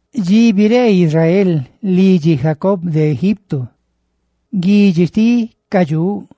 Dxi Israel, lidxi Jacob, biree de Egipto, guidxi xtiꞌ ca dxuꞌ,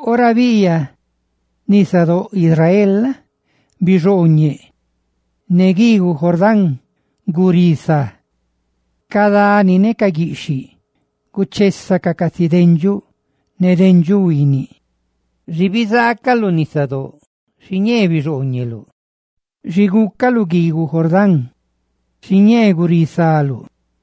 Ora biꞌyaꞌ nisadóꞌ Israel la? bixooñeꞌ, ne guiiguꞌ Jordán gurisá. ¡Ca dani ne ca guiꞌxhiꞌ guchésacaꞌ casi dendxuꞌ roꞌ ne dendxuꞌ huiiniꞌ! Xi bizaacaluꞌ, nisadóꞌ, bixooñeluluꞌ. Xi gúcaluꞌ, guiiguꞌ Jordán, gurisaluꞌ.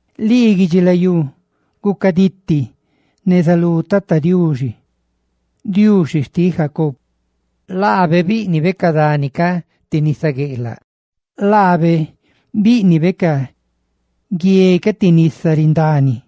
¡Gucaditi lii, guidxilayú, neza lú Tata Diuxi, Diuxi xtiꞌ Jacob! ¡Laabe bíꞌnibe ca dani ca ti nisa gueꞌlaꞌ! ¡Laabe bíꞌnibe ca guie ca ti nisa rindani!